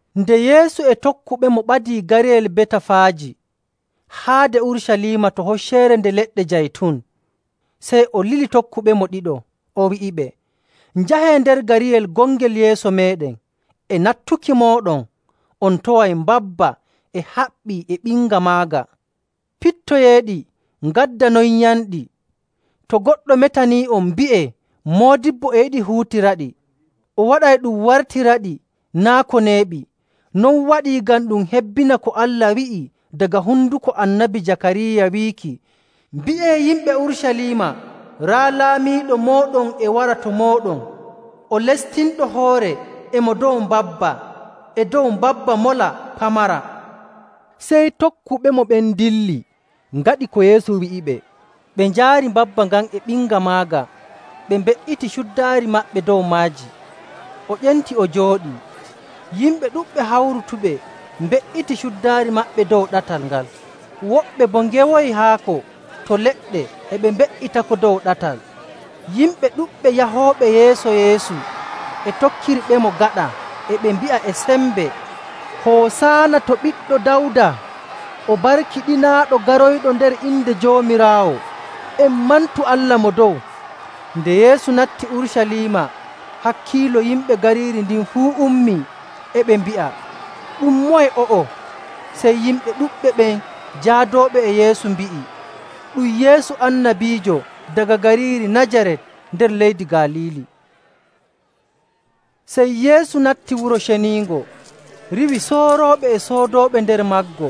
Nde Yeesu e tokkuɓemo ɓadii gariyel Betafaaji haade Urucaliima to Hocceere Nde Leɗɗe Jaytun, sey o lili tokkuɓemo ɗiɗo. O wi'iɓe, “Njahee nder gariyel gongel yeeso meeɗen. E nattuki mooɗon, on taway mbabba e haɓɓii e ɓinga maaga. Pittoyeeɗi ngaddanonyamɗi. To goɗɗo metanii'on, mbi'ee, ‘Moodibbo e yiɗi huutiraɗi, o waɗay ɗum wartiraɗi naa' ko neeɓi.’” Non waɗii ngam ɗum hebbina ko Allah wi'i daga honduko Annabi Jakaariya, wiiki, “Mbi'ee yimɓe Urucaliima, ‘Raa laamiiɗo mooɗon e wara to mooɗon! O lestinɗo hoore e mo dow mbabba, e dow mbabba mola pamara.’”. Sey tokkuɓemo ɓen ndilli, ngaɗi ko Yeesu wi'iɓe. Ɓe njaari mbabba ngan e ɓinga maaga, ɓe mbe''iti cuddaari maɓɓe dow maaji, o ƴenti o jooɗi. Yimɓe ɗuɗɓe hawrutuɓe mbe''iti cuddaari maɓɓe dow ɗatal ngal, woɓɓe boo ngewoyi haako to leɗɗe e mbe''itako dow ɗatal. Yimɓe ɗuɗɓe yahooɓe yeeso Yeesu e tokkirɓemo gaɗa e ɓe mbi'a e sembe, “Hosaana: Ma'ana Hosaana woni mantuki. to Ɓiɗɗo Dawda! O barkiɗinaaɗo garoyɗo nder inde Joomiraawo! En mantu Allah Mo Dow!”. Nde Yeesu natti Urucaliima, hakkiilo yimɓe gariiri ndin fuu ummii, e ɓe mbi'a, “Ɗum moye o'o?” Sey yimɓe ɗuɗɓe ɓen jaadooɓe e Yeesu mbi'i, “Ɗum Yeesu, annabiijo daga gariiri Najarat nder leydi Galiili.” Sey Yeesu natti Wuro Ceniingo riiwi soorooɓe e soodooɓe nder maggo.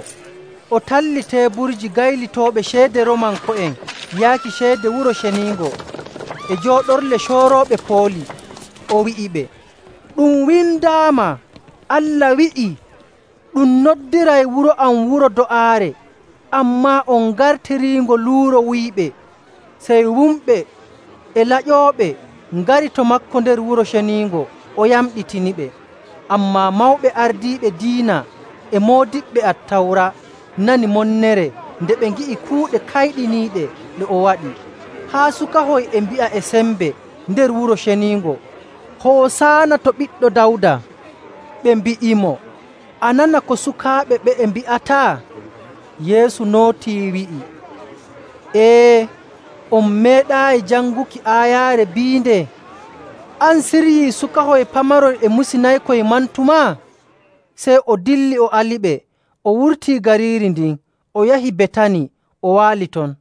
O talli teeburji gaylitooɓe ceede Roomanko'en yaaki ceede Wuro Ceniingo e jooɗorle coorooɓe pooli. O wi'iɓe, “Ɗum windaama Allah wi'ii, ‘Ɗum noddiray wuro am wuro do'aare,’ ammaa on ngartiriingo luuro wuyɓe!”. Sey wumɓe e laƴooɓe ngari to maako nder Wuro Ceniingo, o yamɗitiniɓe. Ammaa mawɓe ardiiɓe diina e moodiɓɓe Attawra nani monnere nde ɓe ngi'i kuuɗe kayɗiniiɗe ɗe o waɗi, haa sukahoy e mbi'a e sembe nder Wuro Ceniingo, “Hosaana to Ɓiɗɗo Dawda!” Ɓe mbi'imo, “A nana ko sukaaɓe ɓe'e mbi'ata?” Yeesu nootii, wi'i, “Ee. On meeɗaayi janguki aayaare biinde, ‘An siryi sukahoy pamaroy e musinaykoy mantumaa?’”. Sey o dilli o aliɓe o wurtii gariiri ndin o yahi Betani o waali ton.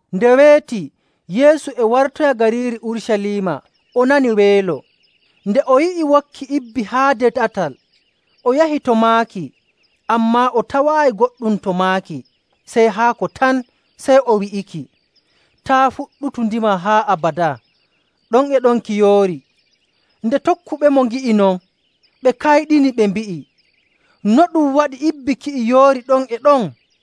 Nde weeti Yeesu e wartoya gariiri Urucaliima o nani weelo. Nde o yi'i wokki ibbi haade ɗatal, o yahi to maaki, ammaa o tawaayi goɗɗum to maaki sey haako tan. Sey o wi'iki, “Taa' fuɗɗutu ndimaa haa abadaa!” Ɗon e ɗon ki yoori. Nde tokkuɓemo ngi'i non, ɓe kayɗini, ɓe mbi'i, “No ɗum waɗi ibbi ki'i yoori ɗon e ɗon?”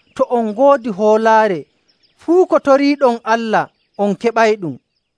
To on ngoodi hoolaare, fuu ko toriiɗon Allah on keɓayɗum.”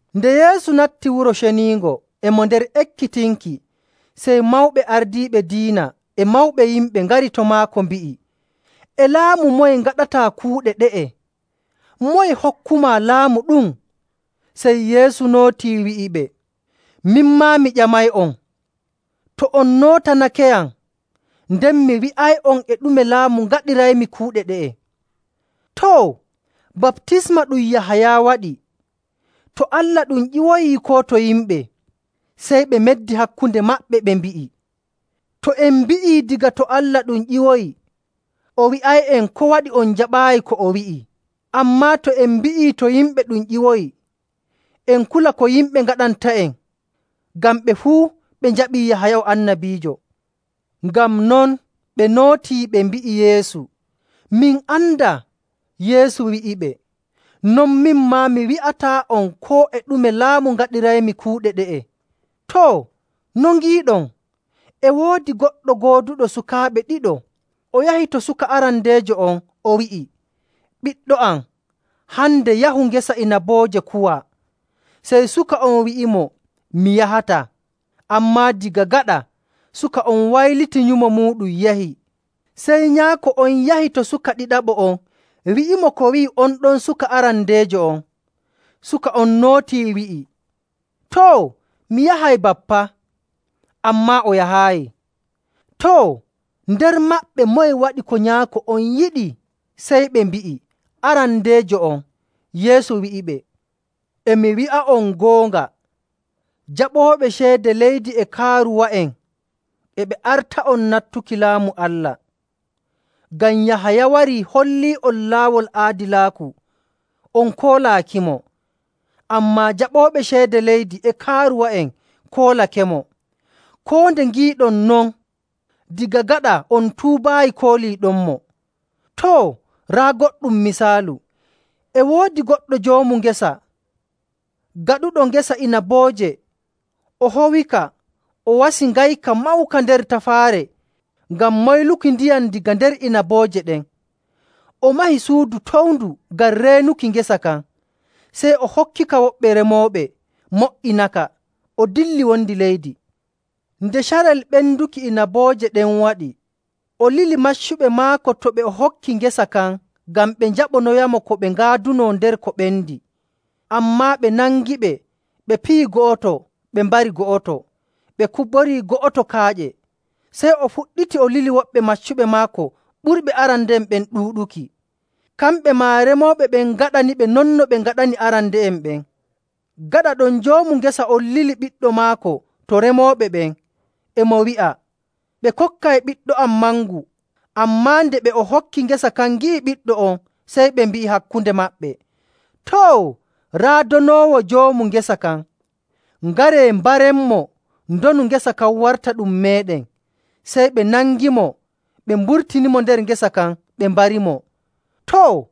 Nde Yeesu natti Wuro Ceniingo e mo nder ekkitinki, sey mawɓe ardiiɓe diina e mawɓe yimɓe ngari to maako mbi'i, “E laamu moye ngaɗataa kuuɗe ɗe'e? Moye hokkumaa laamu ɗum?” Sey Yeesu nootii, wi'iɓe, “Min maa mi ƴamay'on. To on nootanakeyam, nden mi wi'ay'on e ɗume laamu ngaɗiraymi kuuɗe ɗe'e. Too, baptisma ɗum Yahaya waɗi, to Allah ɗum ƴiwoyi koo to yimɓe?” Sey ɓe meddi hakkunde maɓɓe, ɓe mbi'i, “To en mbi'ii, ‘Daga to Allah ɗum ƴiwoyi,’ o wi'ay'en, ‘Ko waɗi on jaɓaayi ko o wi'i?’ Ammaa to en mbi'ii, ‘To yimɓe ɗum ƴiwoyi,’ en kula ko yimɓe ngaɗanta'en, ngam ɓe fuu ɓe njaɓii Yahaya o annabiijo.” Ngam non ɓe nootii, ɓe mbi'i Yeesu, “Min andaa.” Yeesu wi'iɓe, “Non min maa, mi wi'ataa'on koo e ɗume laamu ngaɗiraymi kuuɗe ɗe'e. “Too, no ngiiɗon? E woodi goɗɗo gooduɗo sukaaɓe ɗiɗo. O yahi to suka arandeejo on, o wi'i, ‘Ɓiɗɗo am, hande yahu ngesa inabooje kuwaa.’ Sey suka on wi'imo, ‘Mi yahataa.’ Ammaa daga gaɗa suka on wayliti nyumo muuɗum yahi. Sey nyaako on yahi to suka ɗiɗaɓo on wi'imo ko wi'i on ton suka arandeejo on. Suka on nootii, wi'i, ‘Too, mi yahay, Bappa,’ ammaa o yahaayi. Too, nder maɓɓe moye waɗi ko nyaako on yiɗi?” Sey ɓe mbi'i, “Arandeejo on.” Yeesu wi'iɓe, “E mi wi'a'on goonga, jaɓooɓe ceede leydi e kaaruwa'en e ɓe arta'on nattuki Laamu Allah. Ngam Yahaya warii hollii'on laawol aadilaaku, on koolaakimo. Ammaa jaɓooɓe ceede leydi e kaaruwa'en koolakemo. Koo nde ngiiɗon non, daga gaɗa on tuubaayi kooliiɗonmo.. “Too, raa goɗɗum misaalu. E woodi goɗɗo joomu ngesa gaɗuɗo ngesa inabooje, o howika, o wasi ngayka mawka nder tafaare ngam moyluki ndiyam daga nder inabooje ɗen, o mahi suudu towndu ngam reenuki ngesa kan. Sey o hokkika woɓɓe remooɓe mo''inaka, o dilli wondi leydi.. Nde carel ɓenduki inabooje ɗen waɗi, o lili maccuɓe maako to ɓe o hokki ngesa kan ngam ɓe njaɓonoyamo ko ɓe ngaaduno nder ko ɓendi. Ammaa ɓe nangiɓe ɓe piyi go'oto, ɓe mbari go'oto, ɓe kuborii go'oto kaaƴe. Sey o fuɗɗiti o lili woɓɓe maccuɓe maako ɓurɓe arande'en ɗuuɗuki. Kamɓe maa remooɓe ɓen ngaɗaniɓe non no ɓe ngaɗani arande'en ɓen. Gaɗa ɗon joomu ngesa on lili ɓiɗɗo maako to remooɓe ɓen, e mo wi'a, ‘Ɓe kokkay ɓiɗɗo am mangu.’ Ammaa nde ɓe o hokki ngesa kan ngi'i ɓiɗɗo on, sey ɓe mbi'i hakkunde maɓɓe, ‘Too! Raa donoowo joomu ngesa kan. Ngaree mbarenmo, ndonu ngesa kan warta ɗum meeɗen.’ Sey ɓe nangimo, ɓe mburtinimo nder ngesa kan, ɓe mbarimo. “Too,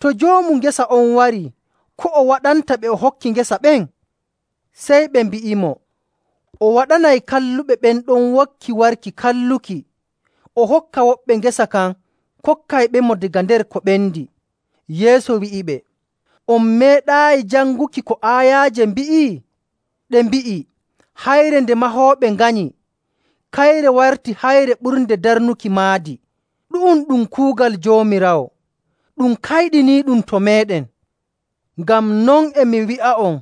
to joomu ngesa on warii, ko o waɗanta ɓe o hokki ngesa ɓen?” Sey ɓe mbi'imo, “O waɗanay kalluɓe ɓen ɗon wokki warki kalluki. O hokka woɓɓe ngesa kan kokkayɓemo daga nder ko ɓendi.” Yeesu wi'iɓe, “On meeɗaayi janguki ko aayaaje mbi'i? Ɗe mbi'i, ‘Hayre nde mahooɓe nganyi, kayre warti hayre ɓurnde darnuki maadi. Ɗu'um ɗum kuugal Joomiraawo, ɗum kayɗiniiɗum to meeɗen!’. “Ngam non e mi wi'a'on,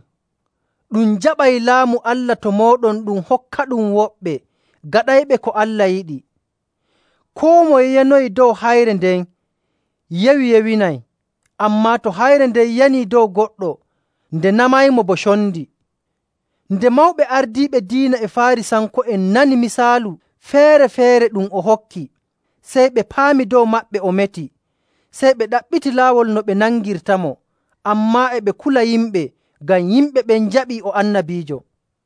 ɗum jaɓay Laamu Allah to mooɗon ɗum hokkaɗum woɓɓe gaɗayɓe ko Allah yiɗi. Koo moye yanoyi dow hayre nden yewi yewinay; ammaa to hayre nden yanii dow goɗɗo, nde namaymo bo condi.” Nde mawɓe ardiiɓe diina e Faarisanko'en nani misaalu feere‑feere ɗum o hokki, sey ɓe paami dow maɓɓe o meti. Sey ɓe ɗaɓɓiti laawol no ɓe nangirtamo, ammaa e ɓe kula yimɓe, ngam yimɓe ɓen njaɓii o annabiijo.